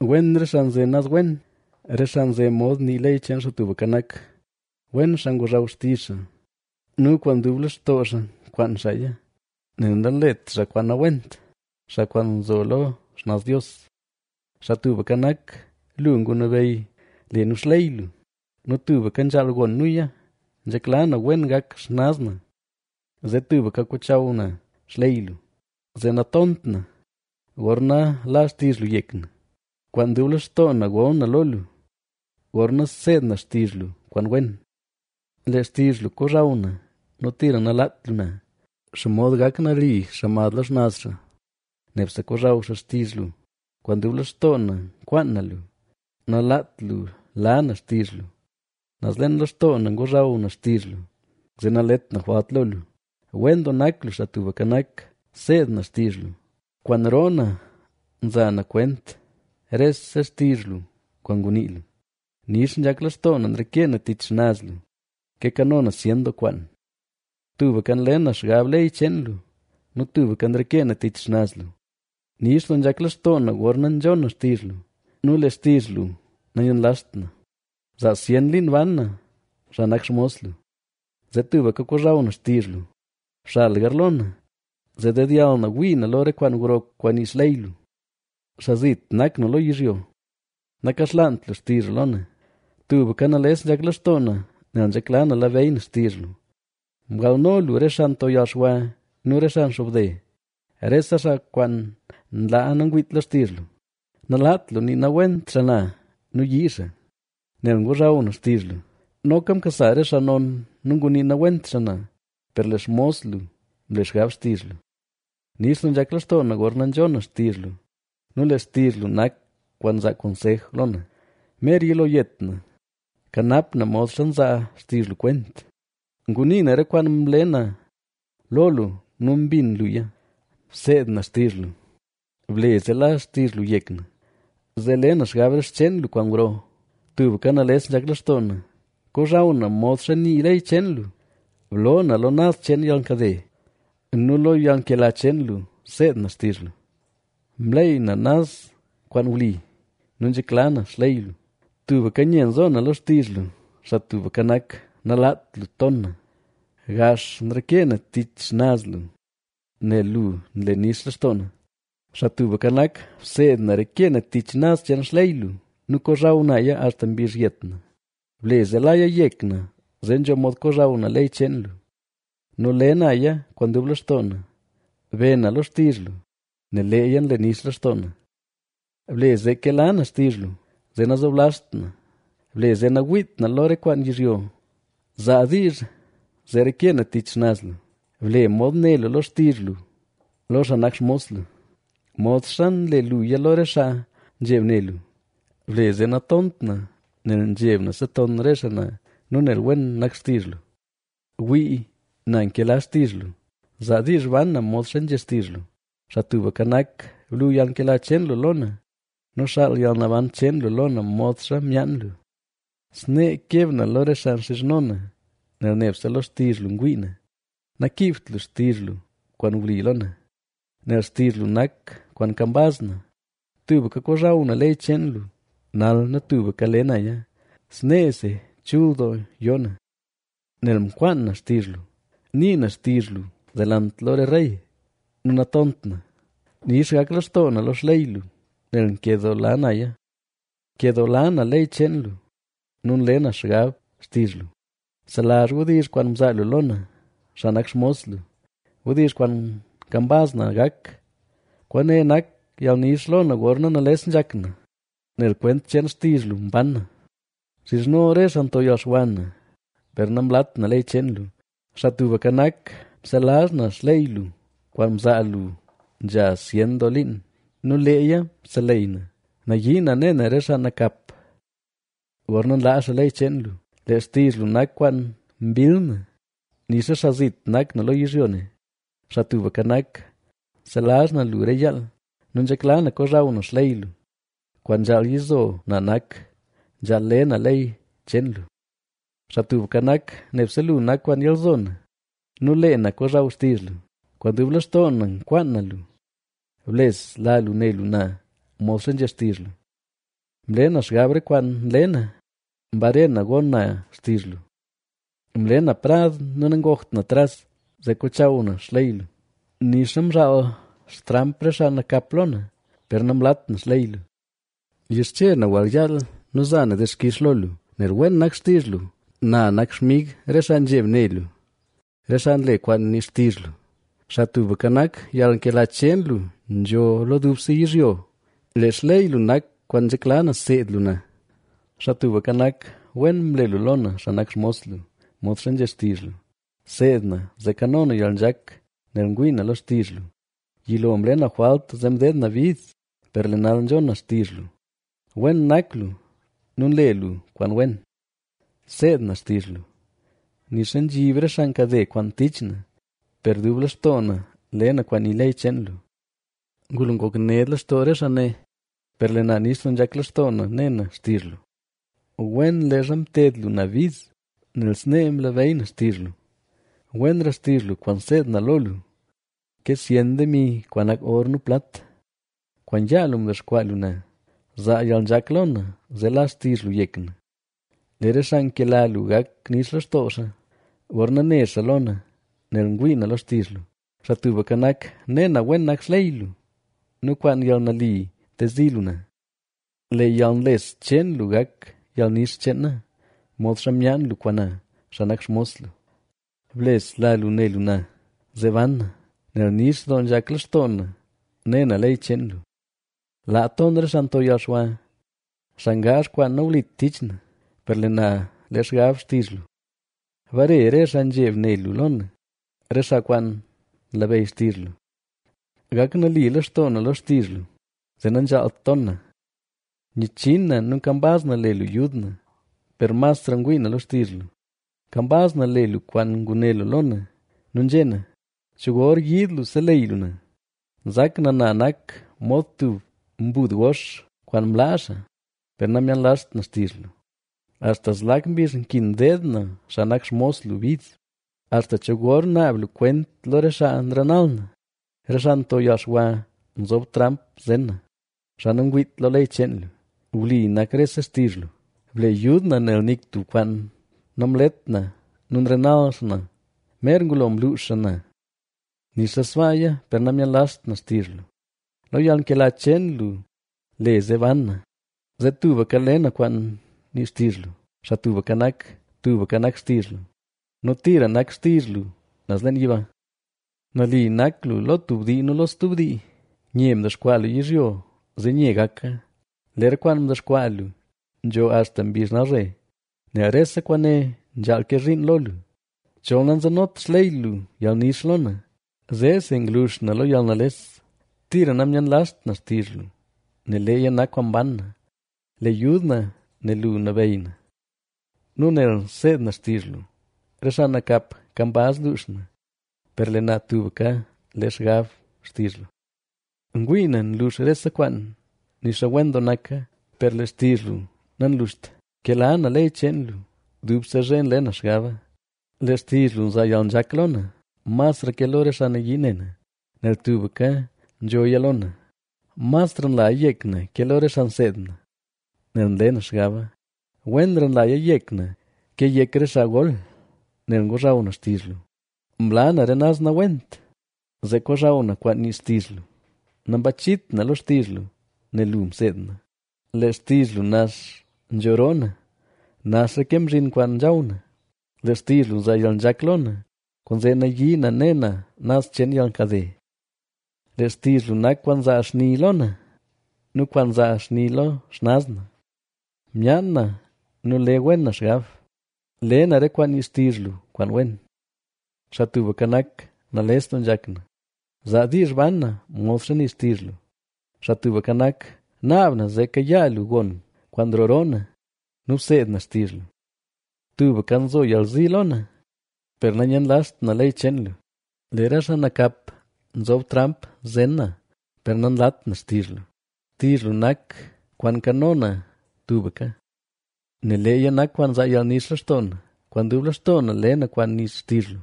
Wen re xaa nze naz wen, re xaa nze mod nii ley cheen Xaa Tubka Nak. Wen xaa ngozhaw xtizh xa nu kwaan dub lextoo xaa nkwaan xaaya, nel nanlet xaa kwaan nawent, xaa kwaan nzo lo xnaz Dios. Xaa Tubka Nak, lu ngunabeyy le nu xley lu nu tubka nzhaal gon nuya. ¡Nzhekla na wen gak xnaz na, zee tubka kochaw na xley lu! Zee natont na, gorna la xtizh lu yek na. Kwaan dub lextoo na gol na lo lu, gorna seed na xtizh lu kwaan wen. ¡Lee xtizh lu kozhaw na! ¡Nu tira nalaat lu na! ¿Xomod gak nali xaa mad lo xnaz xaa? ¡Nebse kozhaw xaa xtizh lu! Kwaan dub lextoo na nkwaan na lu; nalaat lu la na xtizh lu. Naz leen lextoo na ngozhaw na xtizh lu, zee nalet na jwalt lo lu. ¡Wen doo nak lu, Xaa Tubka Nak! ¡Seed na xtizh lu! Kwaan roo na nza na kwent rese xtizh lu kwaan ngunii lu. Nix nzhak lextoo na nreke na tich xnaz lu, ke kano na zyen doo kwaan. Tubka nle na xgab ley cheen lu nu tubka nrekee na tich xnaz lu. Nix doo nzhak lextoo na gorna nzhon na xtizh lu nu lee xtizh lu nayenlazht na. Zaa zyen liin ban na, xaa nak xmos lu, zee tubka kozhaw na xtizh lu. Bxal garlo na, zee dedyall na wii na lo re kwaan gro kwaan nii xley lu. Xaa zit nak na lo yizhyo; nakaxlaant lu xtizh lu lo na. Tubka nales nzhak lextoo na, nel nzhekla na labeyy na xtizh lu. Mgalno lu re xaa nto yalxwa nu re xaa nxobde, rese xaa kwaan nlaa nangwiit lo xtizh lu. Nalaat lu nii nawent xaa na nu yii xaa, nel ngozhaw na xtizh lu. Noka mkasa re xaa non, nu ngunii nawent xaa na, per lee xmos lu, mle xgab xtizh lu. Nix doo nzhak lextoo na gorna nzhon na xtizh lu, nel lee xtizh lu nak kwaan nza konsej lo na. Mer yilo yet na; kanap na modxa nzaa xtizh lu kwent. Ngunii na re kwaan mle na lo lu nu mbin luya; Bseed na xtizh lu. Ble zee la xtizh lu yek na, zee le na xgab re xcheen lu kwaan gro. Tubka nales nzhak lextoo na; kozhaw na modxa nii ley cheen lu. Bloo na lo naz cheen yalnkade nu lo yalnkela cheen lu, seed na xtizh lu. Mleey na naz kwaan wli nu nzhekla na xley lu. Tubka nye nzo na lo xtizh lu; Xaa Tubka Nak, nalaat lu ton na. Gax nrekee na tich xnaz lu, nel lu nle nix lextoo na. Xaa Tubka Nak, bseed na reke na tich naz cheen xley lu nu kozhaw naya axta mbizh yet na. Ble zee laya yek na, zee nzho mod kozhaw na ley cheen lu nu le naya kwaan dub lextoo na. Be na lo xtizh lu, nel leeya nle nix lextoo na. Ble zee kela na xtizh lu, zee nazoblazht na. Ble zee nawiit na lo re kwaan yizhyo; zaa diizh zee reke na tich xnaz lu. Ble mod né lu lo xtizh lu lo xaa nak xmos lu, modxa nle luya lo re xaa nzheb ne lu. Ble zee natont nel nzheb na seton re xaa na nu nel wen nak xtizh lu. Wii, na nkela xtizh lu; zaa diizh ban na modxa nzhé xtizh lu. Xaa Tubka Nak, blu yalnkela cheen lu lo na nu xaal yalnaban cheen lu lo na modxa myaan lu. Snee keb na lo re xaa nxizhno na, nel nebse lo xtizh lu ngwii na. Nakiibt lu xtizh lu kwaan wli lo na, nel xtizh lu nak kwaan kambaz na. Tubka kozhaw na ley cheen lu, nal nu tubka le naya. Sneesi chul doo yoo na, nel mkwaan na xtizh lu. Nii na xtizh lu delant lo re rey nu natont na. Nix gak lextoo na lo xley lu, nel nkedoola naya. Nkedoola na ley cheen lu nu nle na xgab xtizh lu. Selazh wdizh kwaan mzaa lu lo na, xaa nak xmos lu, wdizh kwaan kambaz na gak. Kwaane nak yalnix lo na gorna nales nzhak na, nel kwent cheen xtizh lu mban na. Nxizhno re xaa nto yalxwa na, per namlat na ley cheen lu. Xaa Tubka Nak, mselazh na xley lu kwaan mzaa lu nzha zyen doo liin nu leeya mseleyy na. Nayii na ne na re xaa nakap, gorna nlaa xaa ley cheen lu. Lee xtizh lu nak kwaan mbill na, nixa xaa zit nak na lo yizhyo ne. Xaa Tubka Nak, nselazh na lu re yaal nu nzhekla na kozhaw na xley lu. Kwaan nzhaal yizo na nak, nzhaal le na ley cheen lu. Xaa Tubka Nak, nebse lu nak kwaan yalzo na nu lee na kozhaw xtizh lu. Kwaan dub lextoo na nkwaan na lu; blesla lu ne lu na modxa nzhé xtizh lu. Mle na xgab re kwaan nle na, mbare na gon na xtizh lu. Mle na prad nu nangokt na tras, zee kochaw na xley lu. Nixa mzhaal xtramp re xaa nakap lo na, per namlat na xley lu. Nyixche na wall yaal nu nza na dixkix lo lu, nel wen nak xtizh lu. Na nak xmig re xaa nzheb ne lu, re xaa nle kwaan nii xtizh lu. Xaa Tubka Nak, yalnkela cheen lu nzho lo dubse yizhyo; lee xley lu nak kwaan nzhekla na seed lu na. Xaa Tubka Nak, wen mle lu lo na, xaa nak xmos lu, modxa nzhé xtizh lu. Seed na, zee kano na yalnzhak, nel ngwii na lo xtizh lu. Yilo mle na jwalt zee mdeed na bid, per lee nal nzhon na xtizh lu. Wen nak lu nu nle lu kwaan wen; seed na xtizh lu. Nixa nzhib re xaa nkade kwaan tich na, per dub lextoo na le na kwaan nii ley cheen lu. Ngulo ngok ned lextoo re xaa ne, per lee na nix doo nzhak lextoo na ne na xtizh lu. Wen leezha mted lu na bid, nel snee mlabeyy na xtizh lu. Wenra xtizh lu kwaan nseed na lo lu, ke zyen demi kwaan nak or nu plat. Kwaan yaa lu mdexkwaa lu na; zaa yalnzhak lo na, zee la xtizh lu yek na. Lee re xaa nkela lu gak nix lextoo xaa, gorna ne xaa lo na, nel ngwii na lo xtizh lu. Xaa Tubka Nak, ne na wen nak xley lu, nu kwaan yalnali ntezi lu na. Lee yalnles cheen lu gak yalnix cheen na, modxa myaan lu kwaan na, xaa nak xmos lu. Blesla lu ne lu na, zee ban na, nel nix doo nzhak lextoo na ne na ley cheen lu. Laa ton re xaa nto yalxwa, xaa ngaazh kwaan nawlit tich na, per lee na le xgab xtizh lu. Bare re xaa nzheb ne lu lo na, re xaa kwaan nlabeyy xtizh lu. Gak nali lextoo na lo xtizh lu, zee nanzhaalt ton na. Nyichin na nu nkambaz na le lu yud na, per masra ngwii na lo xtizh lu. Kambaz na le lu kwaan nguné lu lo na nu nzhé na: “¿Cho gor yiid lu seleyy lu na?” Nzak na nak na mod tub mbud gox kwaan mlaa xaa, per namyenlazht na xtizh lu. ¿Axta zlak mbizh nkin deed na xaa nak xmos lu bid? ¿Axta cho gor naab lu kwent lo re xaa nrenal na? Re xaa nto yalxwa nzob tramp zen na; xaa nangwiit lo ley cheen lu. Wli nak rese xtizh lu; ble yud na, nel nik tub kwaan namlet na nu nrenal xaa na. Mer ngulo mluux xaa na, nixa sbaaya per namyenlazht na xtizh lu. Lo yalnkela cheen lu le zee ban na, zee tubka le na kwaan nii xtizh lu. Xaa Tubka Nak, tubka nak xtizh lu nu tira nak xtizh lu naz leen yiba. Nali nak lu lo tub dii nu lo stub dii; nye mdexkwaa lu yizhyo, zee nye gaka. Lee re kwaan mdexkwaa lu nzho axta mbizh nalzhe, nel rese kwaane nzhaal ke zhiin lo lu. Chol nanzenot xley lu yalnix lo na, zeesi nglux na lo yalnales. Tira nayenlazht na xtizh lu, nel leeya nak kwaan mban na. Le yud na, nel lu nabeyy na, nu nel nseed na xtizh lu. Re xaa nakap kambaz luux na, per lee na tubka le xgab xtizh lu. Ngwii na nlux rese kwaan, nixa wen doo naka, per lee xtizh lu nanluxt. ¡Nkela na ley cheen lu! Dubse zhe nle na xgaba. Lee xtizh lu nzaa yalnzhak lo na, masra ke lo re xaa nayii ne na, nel tubka nzhoya lo na. Masra nlaya yek na ke lo re xaa nseed na, nel nle na xgaba. Wenra nlaya yek na ke yek re xaa gol, nel ngozhaw na xtizh lu. Mla na re naz nawent, zee kozhaw na kwaan nii xtizh lu. Nambachit na lo xtizh lu, nel lu mseed na. Lee xtizh lu nax nzho roo na, naxra ke mzhin kwaan nzhaw na. Lee xtizh lu nzaa yalnzhak lo na, kwaanzee nayii na ne na naz cheen yalnkade. Lee xtizh lu nak kwaan nzaa xni lo na nu kwaan nzaa xni lo xnaz na. Myaan na nu le wena xgab, le na re kwaan nii xtizh lu kwaan wen. Xaa Tubka Nak, nales doo nzhak na; zaa diizh ban na modxa nii xtizh lu. Xaa Tubka Nak, naab na zee kayaa lu gon kwaan nroo roo na nu bseed na xtizh lu. Tubka nzo yalzi lo na, per nanyenlazht na ley cheen lu. Lee re xaa nakap nzob tramp zen na, per nanlat na xtizh lu. Xtizh lu nak kwaan nkano na tubka, nel leeya nak kwaan nzaa yalnix lextoo na. Kwaan dub lextoo na le na kwaan nii xtizh lu,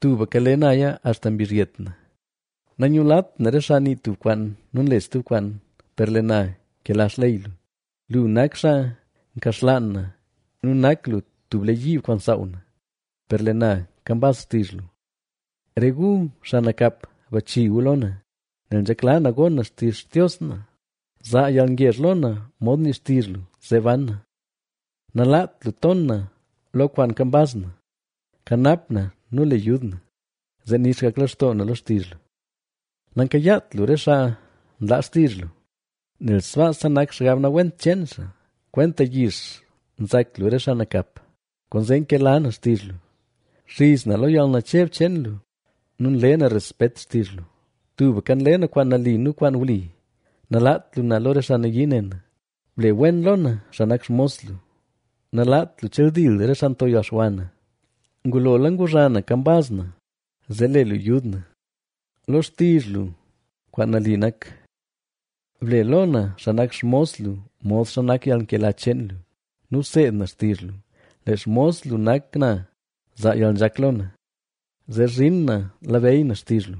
tubka le naya axta mbizh yet na. Nanyulat na re xaa nii tub kwaan nu nle stub kwaan, per lee na nkela xley lu. Lu nak xaa nkaxlaan na nu nak lu tub lee yiib kwaan nsaaw na, per lee na kambaz xtizh lu. Re gu, xaa nakap, bachi gu lo na, nel nzhekla na gon na xtizh Xtios na. Zaa yalngezh lo na mod nii xtizh lu, zee ban na; nalaat lu ton na lo kwaan kambaz na. Kanap na, nu le yud na, zee nix gak lextoo na lo xtizh lu. Nankayaat lu re xaa nlaa xtizh lu, nel sbaasa nak xgab nawent cheen xaa. Kwenta yix nzak lu re xaa nakap, kwaanzee nkela na xtizh lu. Nxiz na lo yalnacheb cheen lu nu nle na respet xtizh lu. Tubka nle na kwaan nali nu kwaan wli; nalaat lu na lo re xaa nayii ne na. Ble wen lo na, xaa nak xmos lu; nalaat lu cheldil re xaa nto yalxwa na. Ngulola nguzha na kambaz na, zee le lu yud na, lo xtizh lu kwaan nali nak. Ble lo na, xaa nak xmos lu, modxa nak yalnkela cheen lu nu bseed na xtizh lu. Lee xmos lu nak na, zaa yalnzhak lo na, zee zhin na labeyy na xtizh lu.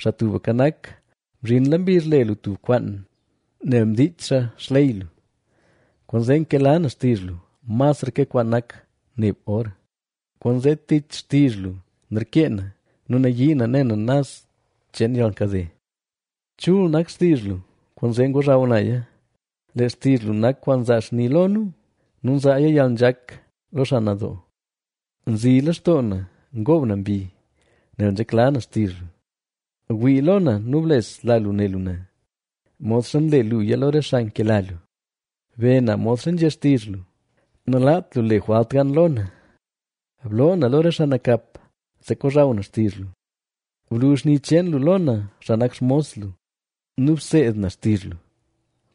Xaa Tubka Nak, mzhinla mbizh le lu tub kwaan, nel mdiich xaa xley lu. Kwaanzee nkela na xtizh lu, masra ke kwaan nak neb or. Kwaanzee tich xtizh lu nrekee na nu nayii na ne na naz cheen yalnkade. Chul nak xtizh lu, kwaanzee ngozhaw naya. Lee xtizh lu nak kwaan nzaa xni lo nu nu nzaaya yalnzhak lo xaa nadoo. Nzi lextoo na ngoob na mbi, nel nzhekla na xtizh lu. Wii lo na nu blesla lu ne lu na, modxa nle luya lo re xaa nkela lu. Be na modxa nzhé xtizh lu, nalaat lu le jwalt gan lo na. Bloo na lo re xaa nakap, zee kozhaw na xtizh lu. Blu xni cheen lu lo na, xaa nak xmos lu nu bseed na xtizh lu.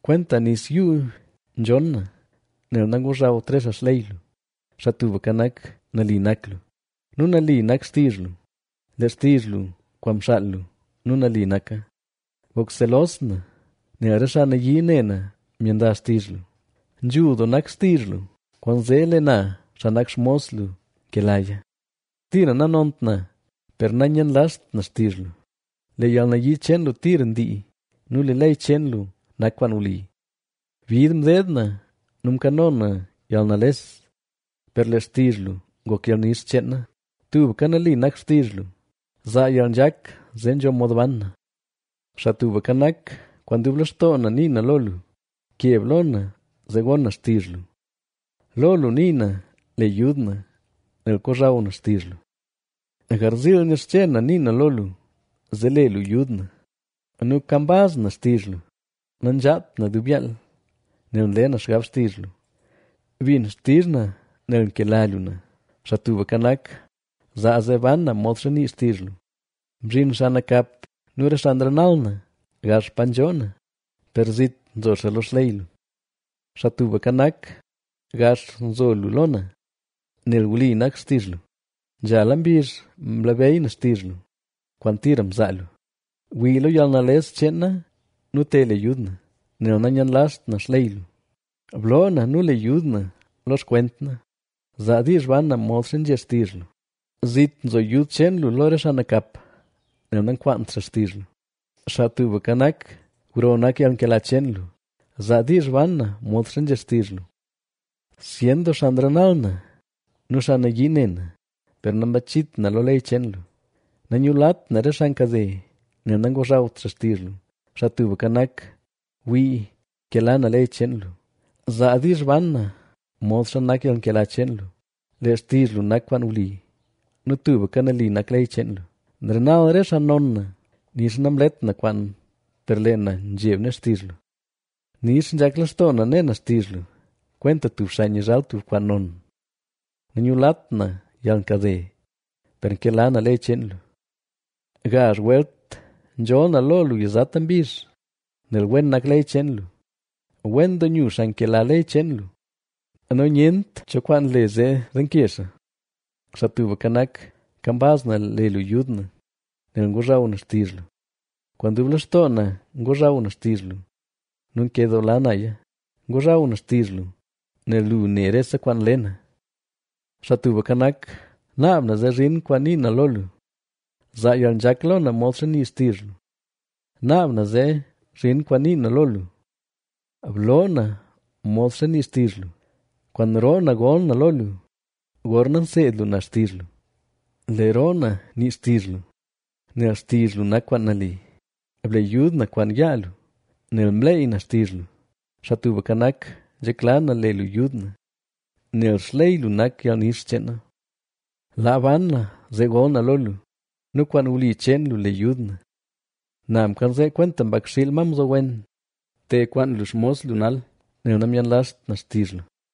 Kwenta nis yuu nzhonn na, nel nangozhawt re xaa xley lu. Xaa Tubka Nak, nali nak lu, nu nali nak xtizh lu. Lee xtizh lu kwaan mxaal lu, nu nali naka. Ngok selos na, nel re xaa nayii ne na myenlazh xtizh lu. Nzhul doo nak xtizh lu, kwaanzee lee na, xaa nak xmos lu, nkelaya. Tira nanont na, per nanyenlazht na xtizh lu. Lee yalnali cheen lu tira ndii nu lee ley cheen lu nak kwaan wli. Bid mdeed na nu mkano na yalnales, per lee xtizh lu ngok yalnix cheena. Tubka nali nak xtizh lu; zaa yalnzhak zee nzho mod ban na. Xaa Tubka Nak, kwaan dub lextoo na nii na lo luk keb lo na zee gon na xtizh lu. Lo lu nii na: “Le yud na”, nel kozhaw na xtizh lu. Garziil nyixche na nii na lo lu, zee le lu yud na nu kambaz na xtizh lu. Nanzhaat na dub yaal, nel nle na xgab xtizh lu. Bin xtizh na nel nkela lu na; Xaa Tubka Nak, zaa zee ban na modxa nii xtizh lu. Mzhin xaa nakap nu re xaa nrenal na gax pa nzhoo na, per zit nzo xaa lo xley lu. Xaa Tubka Nak, gax nzo lu lo na, nel wli nak xtizh lu. Nzhala mbizh mlabeyy na xtizh lu, kwaan tira mzaa lu. Wii lo yalnales cheen na nu te le yud na, nel nayenlazht na xley lu. Bloo na nu le yud na lo xkwent na; zaa diizh ban na modxa nzhé xtizh lu. Zit nzo yud cheen lu lo re xaa nakap, nel nankwaant xaa xtizh lu. Xaa Tubka Nak, gro nak yalnkela cheen lu; zaa diizh ban na modxa nzhé xtizh lu. Zyen doo xaa nrenal na nu xaa nayii ne na, per nambachit na lo ley cheen lu. Nanyulat na re xaa nkade, nel nangozhawt xaa xtizh lu. Xaa Tubka Nak, wii nkela na ley cheen lu; zaa diizh ban na modxa nak yalnkela cheen lu. Lee xtizh lu nak kwaan wli, nu tubka nali nak ley cheen lu. Nrenal re xaa non na, nixa namlet na kwaan, per lee na nzheb ne xtizh lu. Nix nzhak lextoo na ne na xtizh lu, kwenta tub xaa nyizhal tub kwaan non. Nanyulat na yalnkade, per nkela na ley cheen lu. Gazh welt nzholl na lo lu yizata mbizh, nel wen nak ley cheen lu. Wen doo nyu xaa nkela ley cheen lu nu nyent cho kwaan le zee denke xaa. Xaa Tubka Nak, kambaz na le lu yud na, nel ngozhaw na xtizh lu. Kwaan dub lextoo na ngozhaw na xtizh lu nu nkedoola naya. Ngozhaw na xtizh lu, nel lu ne rese kwaan nle na. Xaa Tubka Nak, naab na zee zhin kwaan nii na lo lu; zaa yalnzhak lo na modxa nii xtizh lu. Naab na zee zhin kwaan nii na lo lu; bloo na modxa nii xtizh lu. Kwaan roo na gol na lo lu, gorna nseed lu na xtizh lu. Lee roo na nii xtizh lu, nel xtizh lu nak kwaan nali. Ble yud na kwaan yaa lu, nel mleey na xtizh lu. Xaa Tubka Nak, nzhekla na le lu yud na, nel xley lu nak yalnix cheen na. Laa ban na zee gol na lo lu nu kwaan wli cheen lu le yud na. Na mkanzee kwenta mbakxiil, ma mzowen; te kwaan lu xmos lu nal, nel namyenlazht na xtizh lu.